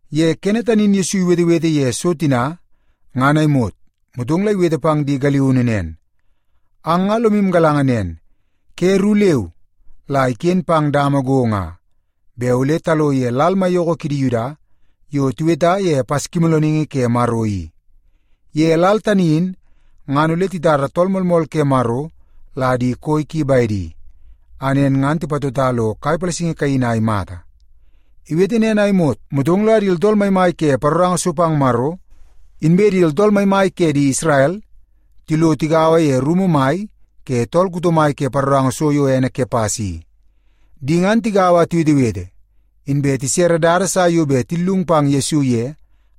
Ye kene tani in Yesu iwetewete ye so tina ngan a imot, motong la iwete pang di galiunu nen, “Ang nga lomu galanga nen, ke ru leu la iken pang dama go nga, bet ole talo ye lal maiyoko kidi Yuda yo tiweta ye Paskimoolooningi Ke Maro i. Ye lal tani in ngan ole titara Tool Moolmool ke Maro la di koi ki bedi, a nen ngan tipatota lo kai palasingi kaini a imata.” Iwete nen a imot, motong la di tooltool maimai ke paroranga so pang Maro, inbe di tooltool maimai ke di Isrel, tilo tigaua ye rumu mai ke tool kuto mai ke paroranga so yo ene Kepas i. Di ngan tigaua a tiwetewete, inbe tisere dada sa yo bet tillung pang Yesu ye,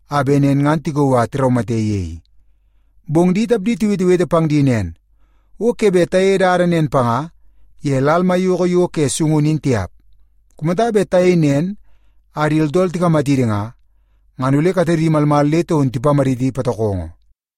a bet nen ngan tikauu a tiraumate ye i. Bong di tapdi tiwetewete pang di nen, “O ke bet tayei dada nen panga ye lal maiyoko yo ke sungunu in tiap. Kumata bet tayei nen a di tooltool tikamatidi nga, ngan ole katedi malmal le taun tipamaditi patokongo.”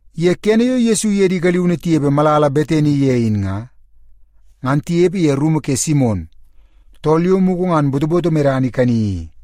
Ye kene yo Yesu iye di galiunu tinepe malala Betani ye in nga, ngan tinepe ye rumu ke Simon, tool yo mugu ngan botoboto medana ikani i.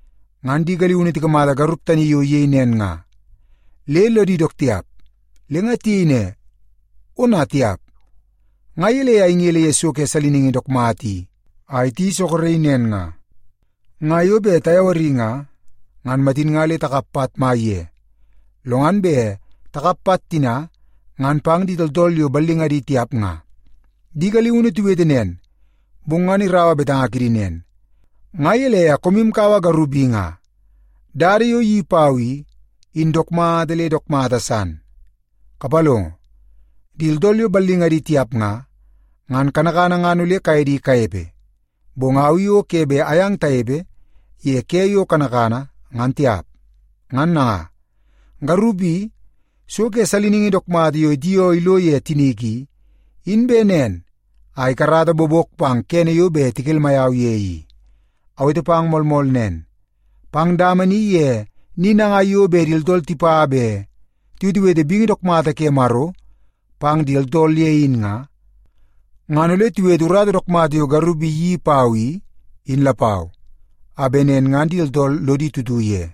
Ngan di galiunu tikamata garup tani yo iyei nen nga, le lodi dook tiap. Le nga tiyei ne, “Ona tiap! Nga gelei a ingele ye so ke saliningi dook mata i a iti soroki nen nga? Nga yo bet tayawari nga, ngan matin nga le takap pat mai ye, lo ngan bet takap pat tina ngan pang di tooltool yo ballingadi tiap nga.” Di galiunu tiwete nen, bong ngan iraua betanga kidi nen, “Nga gelei a koomu kaua garup i nga? Dada yo iyeii pau i, in dook mata le dook mata san. Kapalongo, di tooltool yo ballingadi tiap nga, ngan kanakana ngan ole kaye di kanepe, bong au i o ke bet ayang tanepe ye ke yo kanakana, ngan tiap. Ngan nanga, garup i, so ke saliningi dook mata yo itioo ilo ye tinik i, in bet nen a ikarata bobok pang kene yo bet tikelmai au ye i. Awete pang moolmool nen, pang dama ni ye ni nangai bet di tooltool tipa bet tiwetewete bingi dook mata ke Maro pang di tooltool ye in nga, ngan ole tiwete urata dook mata yo garup i iyeii pau i, in lapau, a bet nen ngan di tooltool lodi tutu ye.”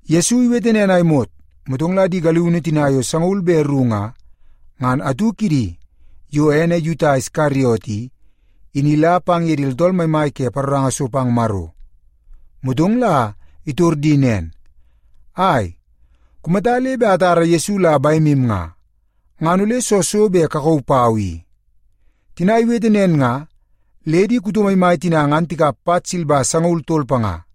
Yesu iwete nen a imot, motong la di galiunu tina yo sangaul be ru nga, ngan atu kidi yo ene Yuta Iskariot i, in ila pang ye di tooltool maimai ke paroranga so pang Maro. Motong la itor di nen, “Ai, kumata le bet atara Yesu la bemu nga, ngan ole soo so bet kakauu pau i?” Tina iwete nen nga, le di kuto maimai tina ngan tikap pat silba sangaul tol panga.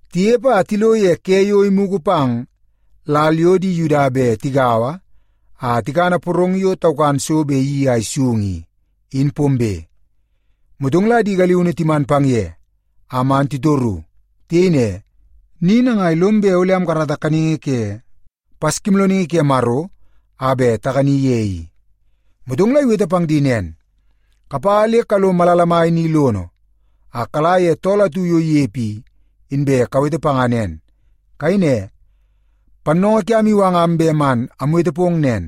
Tinepe a tilo ye ke yo imugu pang lal yo di Yuda bet tigaua a tikana porong yo taukan so bet iyeii a isung i, in pombe. Motong la di galiunu timan pang ye, a man titoru. Tiyei ne, “Ni nangai lom bet ole amkarata kaningi ke Paskimoolooningi ke Maro a bet takani ye i?” Motong la iwete pang di nen, “Kapa le kalo malala mai ni lono, a kala ye tool atu yo inepe i, inbe kawete panga nen. Kayei ne, ‘Pannoongoo kiam iwangam bet man amwete pong nen: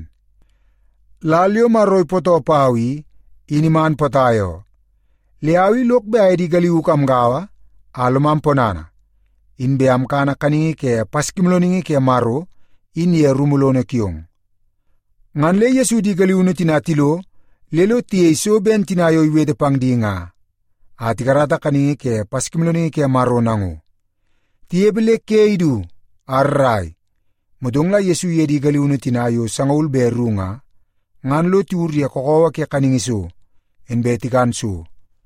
Lal yo Maro ipootoo pau i, in iman potai oo. Le au i lok bet aye di galiuk amgaua a lomam ponana, inbe amkana kaningi ke Paskimoolooningi ke Maro in ye rumu lono kiong.’” Ngan le Yesu di galiunu tina tilo le lo tiyei so ben tina yo iwete pang di nga, a tikarata kaningi ke Paskimoolooningi ke Maro nango. Tinepe le ke idu a rrai, motong la Yesu iye di galiunu tina yo sangaul be ru nga, ngan lo tiwur ye kakawa ke kaningi so, inbe tikan so.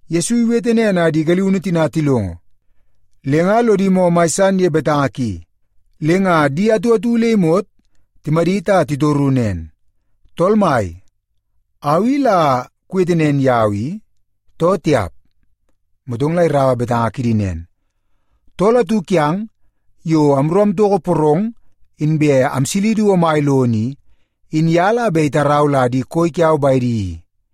Yesu iwete nen a di galiunu tina tilongo, le nga lodi moo mai san ye betanga ki, le nga di atu atu le imot timadit a titoru nen, “Tool Mai, au i la kuwete nen yau i, too tiap?” Motong la iraua torungu kidi nen, “Tool atu kiang yo amru amtoko porong inbe amsili du omai lono i, in ye la bet itarau la di koi kiau bedi i.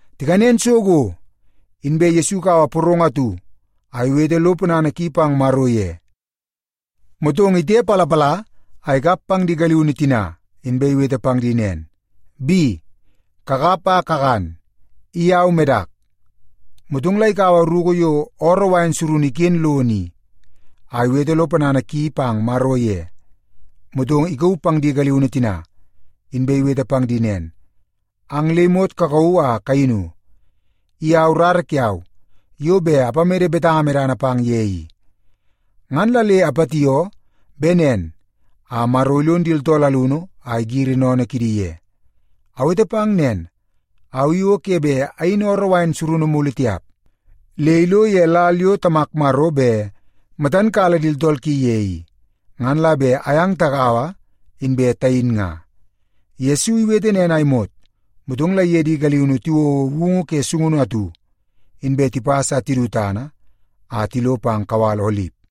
Tikanen so go, inbe Yesu ikaua porong atu a iwete lo ponana ki pang Maro ye, motong la itepalapala a ikap pang di galiunu tina, inbe iwete pang di nen, “Bi, kakap a kakan. I au medak.” Motong la ikaua ruku yo ooroo wain surunu iken lono in a iwete lo ponana ki pang Maro ye, motong ikauu pang di galiunu tina, inbe iwete pang di nen, “Ang le imot kakauu a kayinu. I au rara kiau yo bet apamede betanga medana pang ye i. Ngan la le apatioo bet nen a Maro ilon di tooltool alunu a igiri sennene kidi ye. Awete pang nen, au i o ke bet ayin ooroo wain surunu mulu tiap, le ilo ye lal yo Tamak Maro bet matan kala di tooltool ki ye i, ngan la bet ayang tagaua, inbe tayin nga.” Yesu iwete nen a imot, motong la iye di galiunu tiwouo woungu ke sungunu atu, inbe tipas a tidu tana a tilo pang kawal Olip.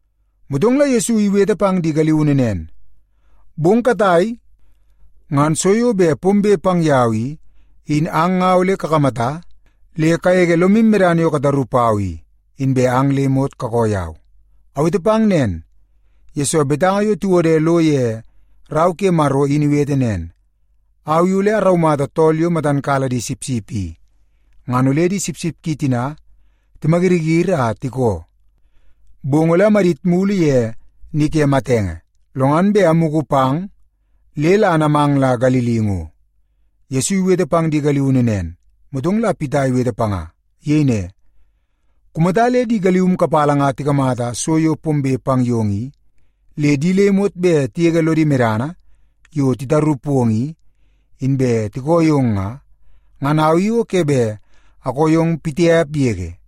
Motong la Yesu iwete pang di galiunu nen, “Bong katai ngan so yo bet pombe pang yau i, in ang nga ole kakamata le kagege lomu medana yo kataru pau i, inbe ang le imot kakoo yau. Awete pang nen, yesoo betanga yo tiwode lo ye Rau ke Maro in iwete nen, ‘Au i ole araumata tool yo matan kala di sipsip i, ngan ole di sipsip ki tina timayiriyiri a tikoo.’ Bong ole amadit mulu ye ni ke matenge, lo ngan bet amugu pang le la anamang la Galili ngo.” Yesu iwete pang di galiunu nen, motong la Pita iwete panga. Iyei ne, “Kumata le di galium kapala nga tikamata so yo pombe pang yong i, le di le imot bet tigege lodi medana yo titaru pong i, inbe tikoo yong nga, ngan au i o ke bet akoo yong pitiap yege.”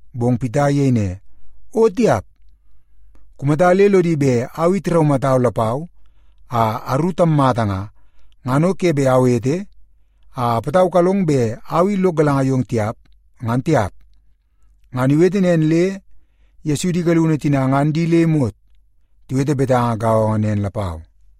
Bong Pita iyei ne, “O tiap! Kumata le lodi bet au i tiraumatau lapau a aru tammata nga, ngan o ke bet awete a apataukalong bet au i lok galanga yong tiap, ngan tiap.” Ngan iwete nen le Yesu di galiunu tina ngan di le imot tiwete betanga gaongo nen lapau.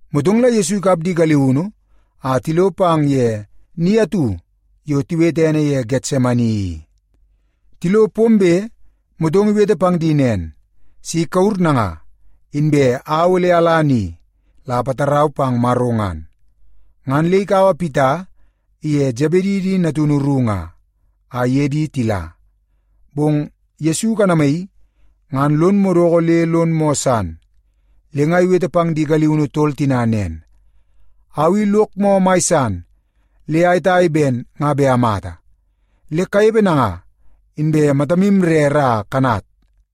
Motong la Yesu ikap di galiunu a tilo pang ye ni atu yo tiwete ene ye Getsemani i. Tilo pombe, motong iwete pang di nen, “Si kawur nanga, inbe au ole ala ni la apatarau pang Maro ngan.” Ngan le ikaua Pita iye Sebedi di natunu ru nga, a iye di tila. Bong Yesu ikanamaii, ngan lon madoko le lon moo san. Le nga iwete pang di galiunu tol tina nen, “Au i lok moo mai san le ayetai ben nga bet amata. Le kanepe nanga, inbe matamu rere a kanat.”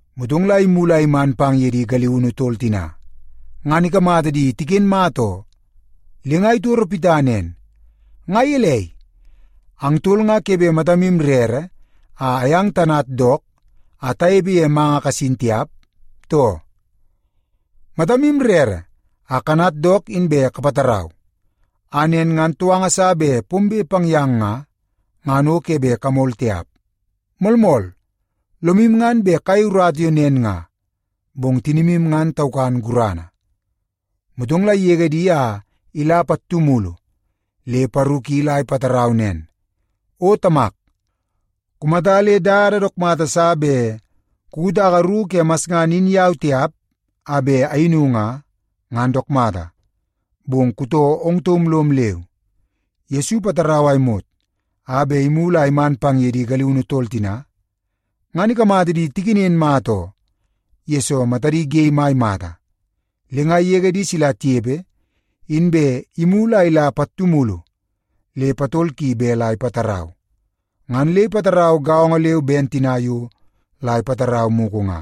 Motong la imulu a iman pang ye di galiunu tol tina, ngan ikamata di tiken mata oo. Le nga itoro Pita nen, “Nga gelei, ang tol nga ke bet matamu rere a ayang tanat dook a tanepe ye manga kasin nga tiap, too? Matamu rere a kanat dook inbe kapatarau, a nen ngan touanga sa bet pombe pang yang nga, ngan o ke bet kamol tiap. Moolmool, lomu ngan bet kayei urata yo nen nga, bong tinimu ngan taukan gurana.” Motong la igege di a ila pattu mulu le paru ki la ipatarau nen, “O Tamak, kumata le dada dook mata sa bet kukutaka ruku ke masngana in yau tiap a bet ayinu nga, ngan dook mata. Bong kutoo ong taum lom leu.” Yesu ipatarau a imot a bet imulu a iman pang ye di galiunu tol tina, ngan ikamata di tikenen mata oo, yesoo matadi ge mai mata. Le nga igege di sila tinepe, inbe imulu a ila pattu mulu le patol ki bet la ipatarau. Ngan le ipatarau gaongo leu ben tina yo la ipatarau mugu nga.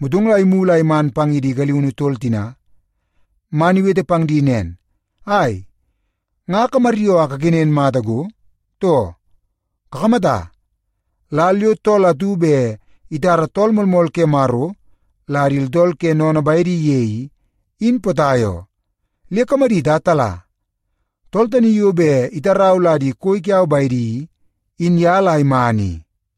Motong la imulu a iman pang ye di galiunu tol tina man iwete pang di nen, “Ai, nga kamaryoo a kakenen mata go, too? Kakamata, lal yo tool atu bet itara Tool Moolmool ke Maro la di tooltool ke sennene bedi ye i, in potai oo. Le kamadit a tala! Tool tani yo bet itarau la di koi kiau bedi i, in ye la iman i.”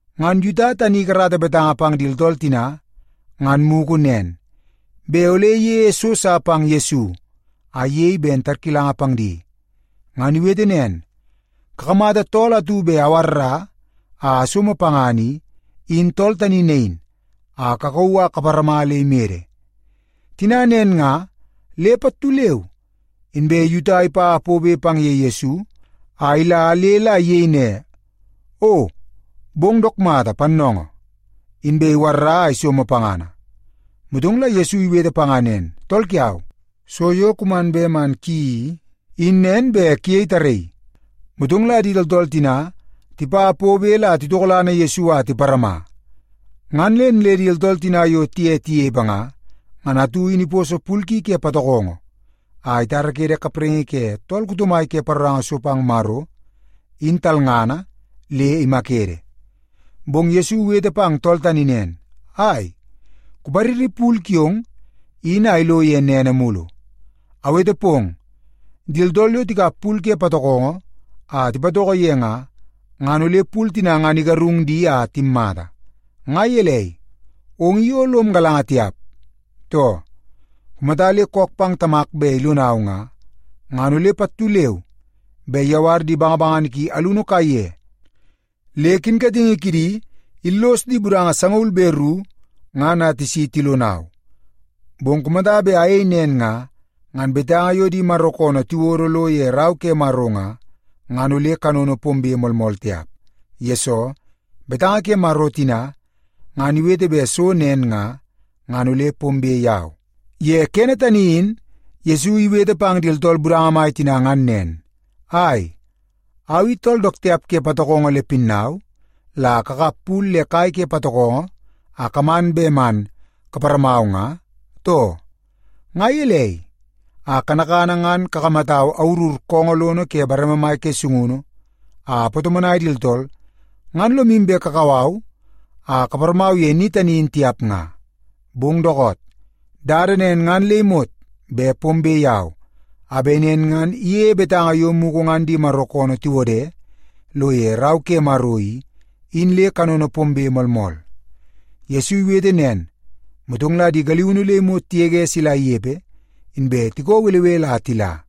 Ngan Yuta tani ikarata betanga pang di tooltool tina ngan mugu nen, bet ole iyeie so sa pang Yesu a iyei ben tarkilanga pang di. Ngan iwete nen, “Kakamata tool atu bet awarra a asomo pangana i, in tool tani nain, a kakauu a kaparama le imede.” Tina nen nga, le pattu leu inbe Yuta ipa pobe pang ye Yesu a ila le la iyei ne, “O bong dook mata, Pannoongoo!” Inbe iwarra a isomo pangana. Motong la Yesu iwete panga nen, “Tool kiau, so yo kuman bet man kuyeii i, in nen bet kuyei tarraii.” Motong la di tooltool tina tipa pobe la titokolana Yesu a tiparama. Ngan nen le di tooltool tina yo tiye tinepe nga, ngan atu in iposo pul ki ke patokongo a itarakede kapraingi ke tool kuto mai ke paroranga so pang Maro, in talngana, le imakede. Bong Yesu iwete pang tool tani nen, “Ai, kupariri pul kiong in a ilo ye nene mulu. Awete pong, di tooltool yo tikap pul ke patokongo a tipatoko ye nga, ngan ole pul tina ngan igarung di a timmata. Nga gelei, ong i o lom galanga tiap, too? Kumata le kook pang Tamak bet ilonau nga, ngan ole pattu leu be iyawar di bangabangana ki alunu kaiye le kinkatingi kidi illos di budanga sangaul be ru ngan a tisi tilonau. Bong kumata bet ayei nen nga, ngan betanga yo di Maro koonoo tiwodo lo ye Rau ke Maro nga, ngan ole kanono pombe moolmool tiap. Yesoo, betanga ke Maro tina ngan iwete bet so nen nga, ngan ole pombe pang yau.” Ye kene tani in Yesu iwete pang di tooltool budanga mai tina ngan nen, “Ai, au i tool dook tiap ke patokongo le pinnau, la kakap pul le kai ke patokongo a kaman bet man kaparamau nga, too? Nga gelei, a kanakana ngan kakamatau awurur koongoo lono ke bareme mai ke sungunu a apatomonai di tooltool, ngan lomu bet kakau au a kaparamau ye ni tani in tiap nga? Bong dookoot, dada nen ngan le imot bet pombe yau, a bet nen ngan iyeie betanga yo mugu ngan di Maro koonoo tiwode lo ye Rau ke Maro i, in le kanono pombe moolmool.” Yesu iwete nen, motong la di galiunu le imot tigege sila inepe, inbe tikoo belebele a tila.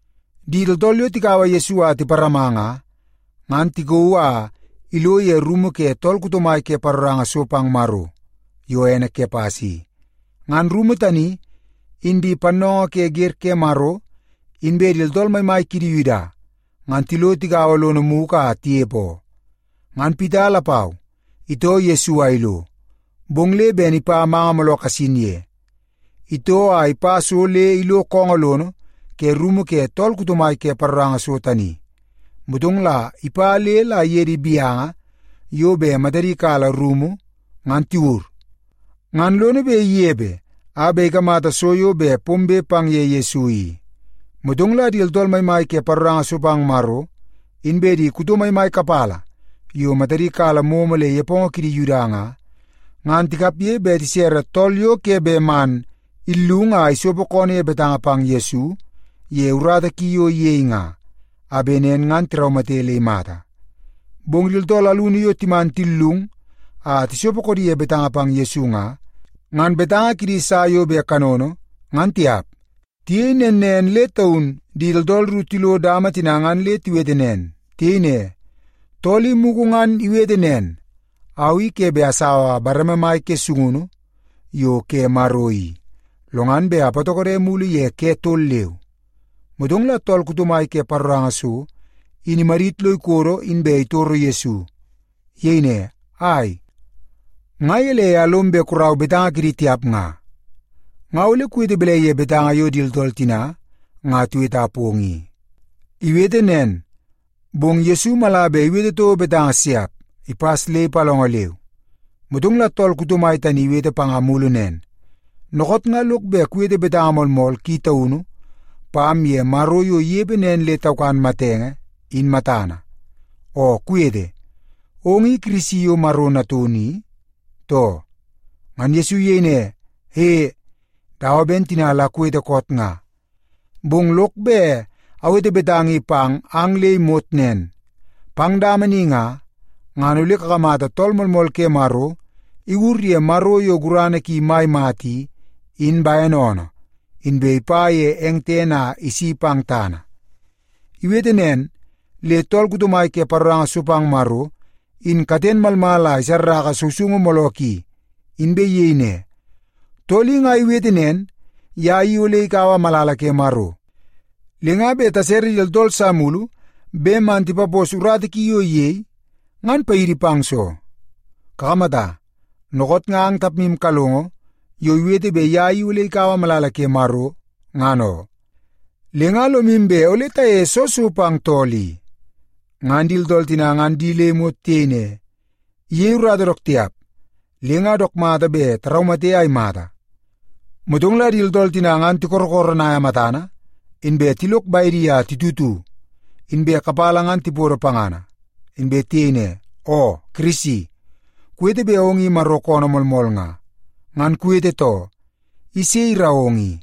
Di tooltool yo tikaua Yesu a tiparama nga, ngan tikauu a ilo ye rumu ke tool kuto mai ke paroranga so pang Maro yo ene Kepas i. Ngan rumu tani, in di pannoongoo ke wer ke Maro inbe di tooltool maimai kidi Yuda, ngan tilo tigaua lono mugu a tinepe oo. Ngan Pita lapau itoo Yesu a ilo, bong le ben ipa manga mooloo kasin ye. Itoo a ipa so le ilo koongoo lono ke rumu ke tool kuto mai ke paroranga so tani, motong la ipa le la iye di gaunu yo bet matadi kala rumu ngan tiwur, ngan lono bet inepe a bet ikamata so yo bet pombe pang ye Yesu i. Motong la di tooltool maimai ke paroranga so pang Maro, inbe di kuto maimai kapala yo matadi kala momo le nepongo kidi Yuda nga, ngan tikapge bet tisere tool yo ke bet man illung a isopo koonoo ye betanga pang Yesu ye urata ki yo iyei nga, a bet nen ngan tiraumate le imata. Bong di tooltool alunu yo timan tillung a tisopo koodi ye betanga pang Yesu nga, ngan betanga kidi sa yo bet kanono, ngan tiap. Tiyei nen nen le taun di tooltool ru tilo dama tina ngan le tiwete nen. Tiyei ne, “Tool i mugu ngan iwete nen, ‘Au i ke bet asaua bareme mai ke sungunu yo ke Maro i, lo ngan bet apatokode mulu ye ke tol leu.’” Motong la tool kuto mai ke paroranga so in imadit lo ikodo, inbe itoro Yesu. Iyei ne, “Ai, nga gelei a lom bet kurau betanga kidi tiap nga? Nga ole kuwete balai ye betanga yo di tooltool tina nga tiweta yong i?” Iwete nen, bong ngan Yesu mala bet iwete toko betanga siap, ipas le ipalongo leu. Motong la tool kuto mai tani in iwete panga mulu nen, “Dookoot nga lok bet kuwete betanga moolmool ki taunu pam ye Maro yo inepe nen le taukan matenge, in matana. Oo kuwete, ong i Kirisi yo Maro Natunu i, too?” Ngan Yesu iyei ne, “E, dawa ben tina la kuwete koot nga. Bong lok bet awete betanga i pang ang nga le imot nen. Pang dama ni nga, ngan ole kakamata Tool Moolmool ke Maro iwur ye Maro yo gurana ki mai mata i, in bene oonoo, inbe ipa ye eng tene a isi pang tana.” Iwete nen, le tool kuto mai ke paroranga so pang Maro in katen malmal a isarraka sousoungu mooloo ki, inbe iyei ne, “Tool i nga iwete nen, ye i ole ikaua malala ke Maro, le nga bet tasere di tooltool sa mulu bet man tipapos urata ki yo iyei, ngan paidi pang soo? Kakamata, dookoot nga ang tapmu kalongo yo iwete bet ye i ole ikaua malala ke Maro, ngan oo. Le nga lomu bet ole tayeie soo so pang tool i?” Ngan di tooltool tina ngan di le imot tiyei ne, “Iyei urata dook tiap, le nga dook mata bet taraumate a imata.” Motong la di tooltool tina ngan tikorokoronaia matana, inbe tilok bedi a titutu, inbe kapala ngan tipodo pangana, inbe tiyei ne, “Oo Kirisi, kuwete bet ong i Maro koonoo moolmool nga, ngan kuwete too. I sei irau ong i?”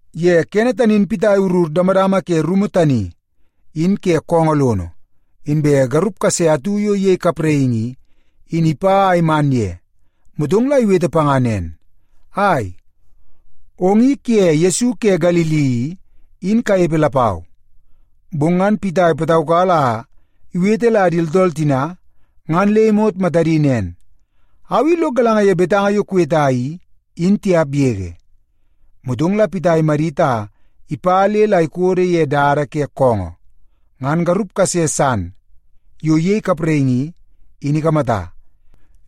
Ye kene tani in Pita iwurur damadama ke rumu tani in ke koongoo lono, inbe garup kase atu yo iyei kapraingi i, in ipa a iman ye. Motong la iwete panga nen, “Ai, ong i kuye Yesu ke Galili i, in kanepe lapau.” Bong ngan Pita ipataukala a iwete la di tooltool tina ngan le imot matadi nen, “Au i lok galanga ye betanga yo kuweta i, in tiap yege.” Motong la Pita imadit a ipa le la ikodo ye dada ke koongoo, ngan garup kase san yo iyei kapraingi i, in ikamata.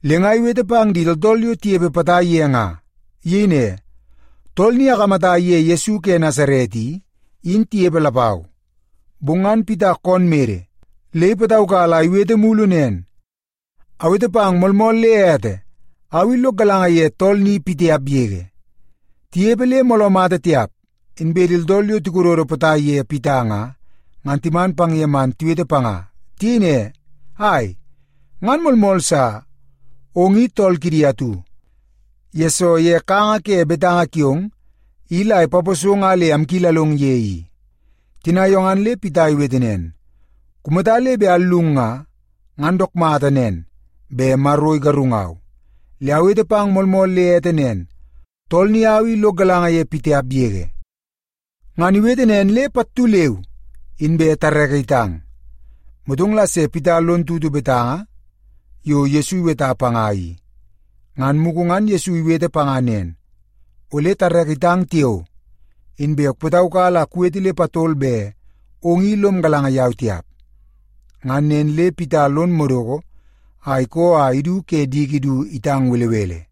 Le nga iwete pang di tooltool yo tinepe potai ye nga. Iyei ne, “Tool ni akamata iye Yesu ke Nasaret i, in tinepe lapau.” Bong ngan Pita koon mede le ipataukala a iwete mulu nen, “Awete pang moolmool le ete, au i lok galanga ye tool ni pitiap yege!” Tinepe le mooloo mata tiap, inbe di tooltool yo tikododo potai ye Pita nga, ngan timan pang ye man tiwete panga. Tiyei ne, “Ai, ngan moolmool sa! Ong i tool kidi atu, yesoo ye kanga ke betanga kiong i la ipaposong a le amkilalong ye i.” Tina yo ngan le Pita iwete nen, “Kumata le bet allung nga, ngan dook mata nen bet Maro igarungau. Le awete pang moolmool le ete nen, tool ni au i lok galanga ye pitiap yege!” Ngan iwete nen le pattu leu inbe tareke itang. Motong la se Pita lon tutu betanga yo Yesu iweta panga i. Ngan mugu ngan Yesu iwete panga nen, “Ole tareke itang tiao, inbe ole kupataukala a kuwete le patol bet ong i lom galanga yau tiap.” Ngan nen le Pita lon madoko a ikoo a idu ke diki du itang belebele.